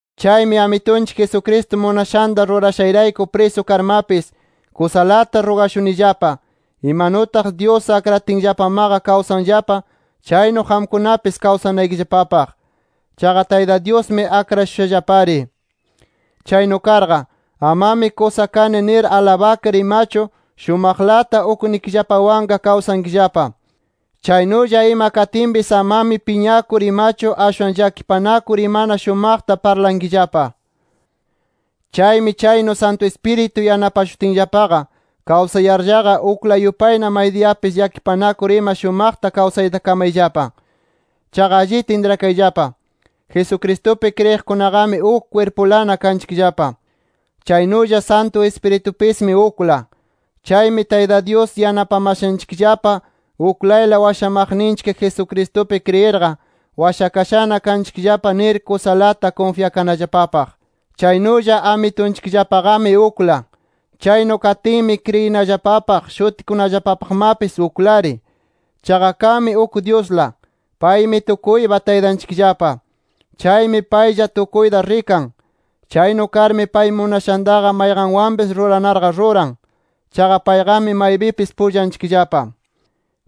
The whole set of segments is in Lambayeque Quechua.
Chaymi Amitunchik Jesucristo munashanta rurashayrayku prisu karmapis, kusalata rugashunillapa, imanutaq Dyus akratinllapamaqa kawsanllapa, chaynu qamkunapis kawsanaykillapapaq. Chaqa Tayta Dyusmi akrashushallapari. Chaynu karqa, amami kusa kani nir alabakar imachu, shumaqlata ukninchikllapawanqa kawsankillapa. Chaynulla ima katinpis amami piñakur imachu ashwan llakipanakur imana shumaqta parlankillapa. Chaymi chaynu Santu Ispiritu yanapashutinllapaqa, kawsayarllaqa ukla yupayna maydiyapis llakipanakur ima shumaqta kawsayta kamayllapa. Chaqa allita intrakayllapa: Jesucristupi kriyiqkunaqami uk kwirpulana kanchikllapa. Chaynulla Santu Ispiritupismi ukla. Chaymi Tayta Dyus yanapamashanchikllapa uklayla washamaqninchik Jesucristupi kriyirqa, washakashana kanchikllapa nir kusalata kunfyakanallapapaq. Chaynulla Amitunchikllapaqami ukla. Chaynu katinmi kriyinallapapaq, shutikunallapapaqmapis uklari. Chaqa kanmi uk Dyusla. Paymi tukuypa Taytanchikllapa. Chaymi paylla tukuyta rikan. Chaynu karmi pay munashantaqa, mayqanwanpis ruranarqa ruran. Chaqa payqami maypipis pullanchikllapa.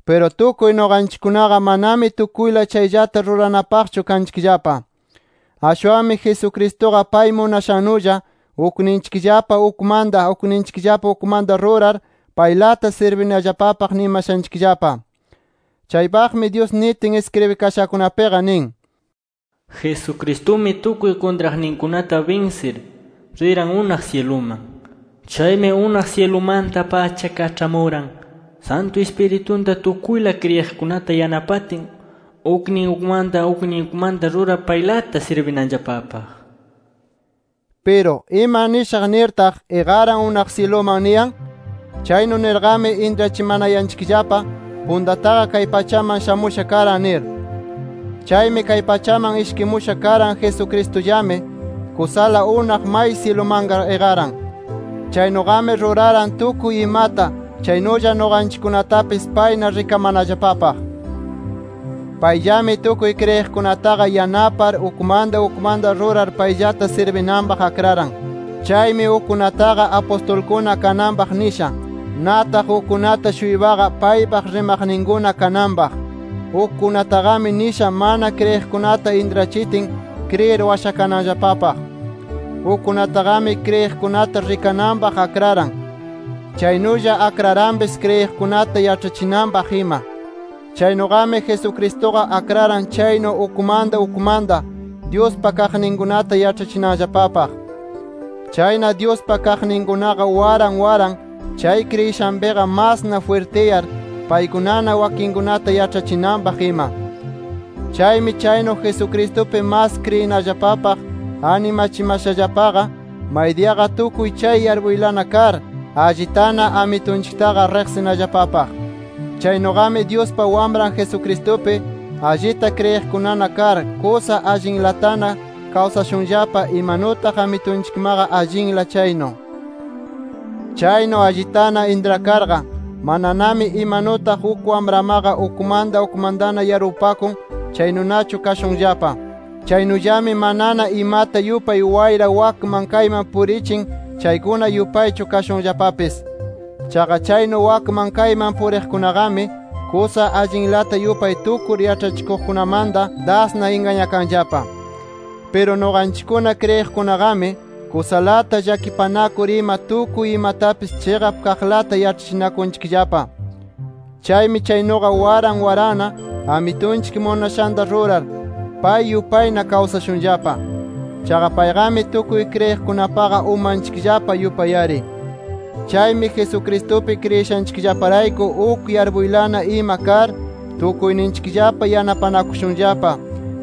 Piru tukuy nuqanchikkunaqa manami tukuyla chayllata ruranapaqchu kanchikllapa. Ashwanmi Jesucristuqa pay munashannulla ukninchikllapa ukmanta, ukninchikllapa ukmanta rurar, paylata sirbinallapapaq nimashanchikllapa. Chaypaqmi Dyus nitin iskribikashakunapiqa nin: “Jesucristumi tukuy kuntraqninkunata binsir, riran unaq syiluman. Chaymi unaq syilumanta-pacha kaĉhamuran Santu Ispiritunta tukuyla kriyiqkunata yanapatin uknin ukmanta uknin ukmanta rurar paylata sirbinanllapapaq” nir. Piru ¿ima nishaq nirtaq, “Iqaran unaq syiluman” niyan? Chaynu nirqami intrachimanayanchikllapa puntataqa kay pachaman shamusha karan nir. Chaymi kay pachaman ishkimusha karan Jesucristullami, kusala unaq may syilumanqa iqaran. Chaynuqami ruraran tukuy imata, chaynulla nuqanchikkunatapis payna rikamanallapapaq. Payllami tukuy kriyiqkunataqa yanapar ukmanta ukmanta rurar payllata sirbinanpaq akraran. Chaymi ukkunataqa apustulkuna kananpaq nisha. Nataq ukkunata-shuypaqa, paypaq rimaqninkuna kananpaq. Ukkunataqami nisha mana kriyiqkunata intrachitin, kriyir washakananllapapaq. Ukkunataqami kriyiqkunata rikananpaq akraran. Chaynulla akraranpis kriyiqkunata yaĉhachinanpaq ima. Chaynuqami Jesucristuqa akraran chaynu ukmanta ukmanta, Dyuspa kaqninkunata yaĉhachinanllapapaq. Chayna Dyuspa kaqninkunaqa waran waran chay kriyishanpiqa masna jwirtiyar, paykunana wakinkunata yaĉhachinanpaq ima. Chaymi chaynu Jesucristupi mas kriyinallapapaq animachimashallapaqa, maydiyaqa tukuy chay yarpuylana kar, allitana Amitunchiktaqa riqsinallapapaq. Chaynuqami Dyuspa Wamran Jesucristupi, allita kriyiqkunana kar, kusa allinlatana kawsashunllapa imanutaq Amitunchikmaqa allinla chaynu. Chaynu allitana intrakarqa, mananami imanutaq uk wamramaqa ukmanta ukmantana yarpupakun, chaynunachu kashunllapa. Chaynullami manana imata yupay wayra wakman kayman purichin chaykuna yupaychu kashunllapapis. Chaqa chaynu wakman kayman puriqkunaqami, kusa allinlata yupay tukur yaĉhachikuqkunamanta dasna ingañakanqallapa. Piru nuqanchikkuna kriyiqkunaqami, kusalata llakipanakur ima tukuy imatapis chiqap kaqlata yaĉhachinakunchikllapa. Chaymi chaynuqa waran waranna, Amitunchik munashanta rurar, pay yupayna kawsashunllapa. Chaqa payqami tukuy kriyiqkunapaqa umanchikllapa yupay-ari. Chaymi Jesucristupi kriyishanchikllaparayku uk yarpuylana ima kar, tukuyninchikllapa yanapanakushunllapa,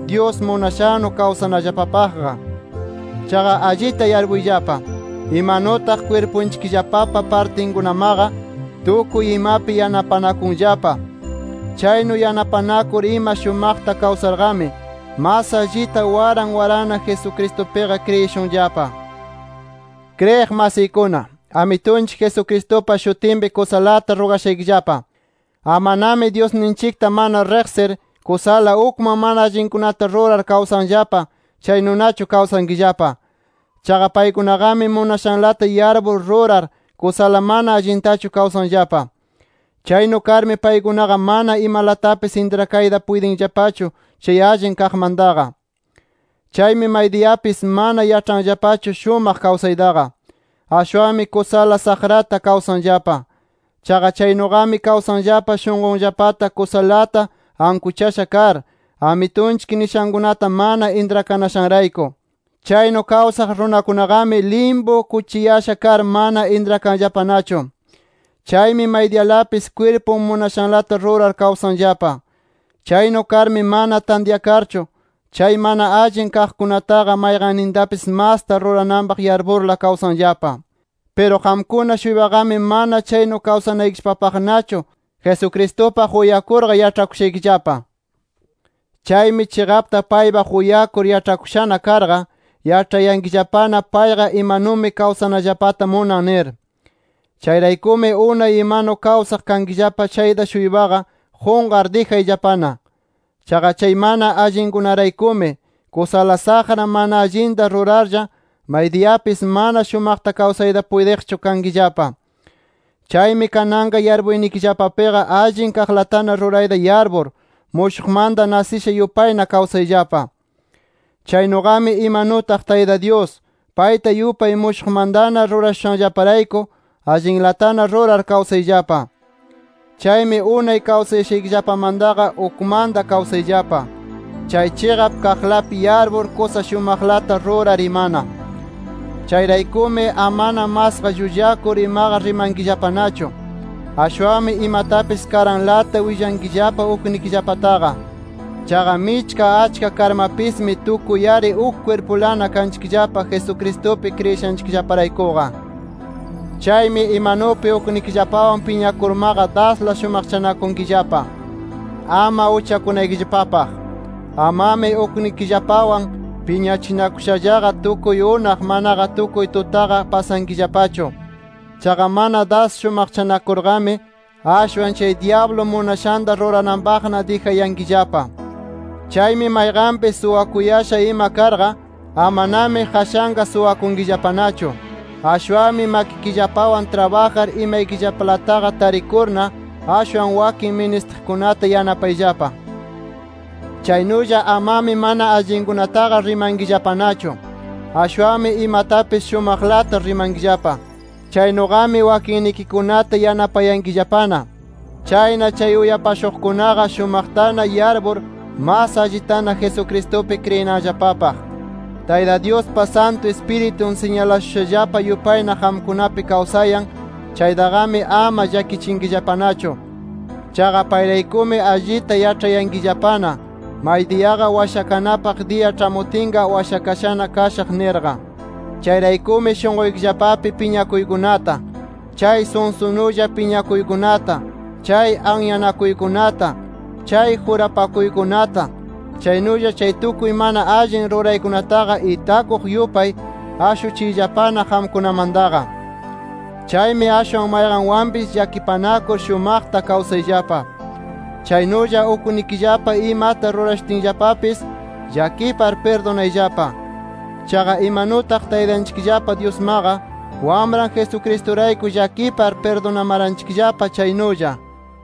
Dyus munashannu kawsanallapapaqqa. Chaqa allita yarpuyllapa: Imanutaq kwirpunchikllapapa partinkunamaqa tukuy imapi yanapanakunllapa. Chaynu yanapanakur ima shumaqta kawsarqami, mas allita waran waranna Jesucristupiqa kriyishunllapa. Kriyiq masiykuna, Amitunchik Jesucristupa shutinpi kusalata rugashaykillapa: Amanami Dyusninchikta mana riqsir, kusala ukman mana allinkunata rurar kawsanllapa, chaynunachu kawsankillapa. Chaqa paykunaqami munashanlata yarpur rurar, kusala mana allintachu kawsanllapa. Chaynu karmi paykunaqa mana imalatapis intrakayta puytinllapachu chay allin kaqmantaqa. Chaymi maydiyapis mana yaĉhanllapachu shumaqta kawsaytaqa; ashwanmi kusala saqrata kawsanllapa. Chaqa chaynuqami kawsanllapa shunqunllapata kusalata ankuchasha kar, Amitunchik nishankunata mana intrakanashanrayku. Chaynu kawsaq runakunaqami, limpu kuchiyasha kar mana intrakanllapanachu. Chaymi maydiyalapis kwirpun munashanlata rurar kawsanllapa. Chaynu karmi mana tantyakarchu, chay mana allin kaqkunataqa mayqannintapis masta rurananpaq yarpurla kawsanllapa. Piru qamkuna-shuypaqami mana chaynu kawsanaykillapapaqnachu Jesucristupaq uyakurqa yaĉhakushaykillapa. Chaymi chiqapta paypaq uyakur yaĉhakushana karqa, yaĉhayankillapana payqa imanumi kawsanallapata munan nir. Chayraykumi unay imanu kawsaq kankillapa chayta-shuypaqa qunqar dijayllapana. Chaqa chay mana allinkunaraykumi, kusala saqra mana allinta rurarlla, maydiyapis mana shumaqta kawsayta puytiqchu kankillapa. Chaymi kananqa yarpuynikillapapiqa allin kaqlatana rurayta yarpur, mushuqmanta nasisha yupayna kawsayllapa. Chaynuqami imanutaq Tayta Dyus, payta yupay mushuqmantana rurashushanllaparayku allinlatana rurar kawsayllapa. Chaymi unay kawsayashaykillapamantaqa ukmanta kawsayllapa, chay chiqap kaqlapi yarpur, kusa shumaqlata rurar imana. Chayraykumi, amana masqa llullakur imaqa rimankillapanachu. Ashwanmi imatapis karanlata willankillapa uknikillapataqa. Chaqa michka achka karmapismi, tukuy-ari uk kwirpulana kanchikllapa Jesucristupi kriyishanchikllaparaykuqa. Chaymi imanupi uknikillapawan piñakurmaqa, dasla shumaqchanakunkillapa, ama uchakunaykillapapaq. Amami uknikillapawan piñachinakushallaqa, tukuy unaq, manaqa tukuy tutaqa pasankillapachu. Chaqa mana das shumaqchanakurqami, ashwan chay dyablu munashanta rurananpaqna dijayankillapa. Chaymi mayqanpis suwakuyasha ima karqa, amanami qashanqa suwakunkillapanachu. Ashwanmi makikillapawan trabajar imaykillapalataqa tarikurna, ashwan wakin ministiqkunata yanapayllapa. Chaynulla amami mana allinkunataqa rimankillapanachu. Ashwanmi imatapis shumaqlata rimankillapa. Chaynuqami wakinnikikunata yanapayankillapana. Chayna chay uyapashuqkunaqa shumaqtana yarpur mas allitana Jesucristupi kriyinanllapapaq. Tayta Dyuspa Santu Ispiritun siñalashushallapa yupayna qamkunapi kawsayan chaytaqami, ama llakichinkillapanachu. Chaqa payraykumi allita yaĉhayankillapana, maydiyaqa washakanapaq diya ĉhamutinqa washakashana kashaq nirqa. Chayraykumi shunquykillapapi piñakuykunata, chay sunsunulla piñakuykunata, chay anyanakuykunata, chay jurapakuykunata, chaynulla chay tukuy mana allin ruraykunataqa itakuq yupay ashuchiyllapana qamkunamantaqa. Chaymi ashwan mayqanwanpis llakipanakur shumaqta kawsayllapa. Chaynulla uknikillapa imata rurashutinllapapis llakipar pirdunayllapa. Chaqa imanutaq Taytanchikllapa Dyusmaqa, Wamran Jesucristurayku llakipar pirdunamaranchikllapa chaynulla.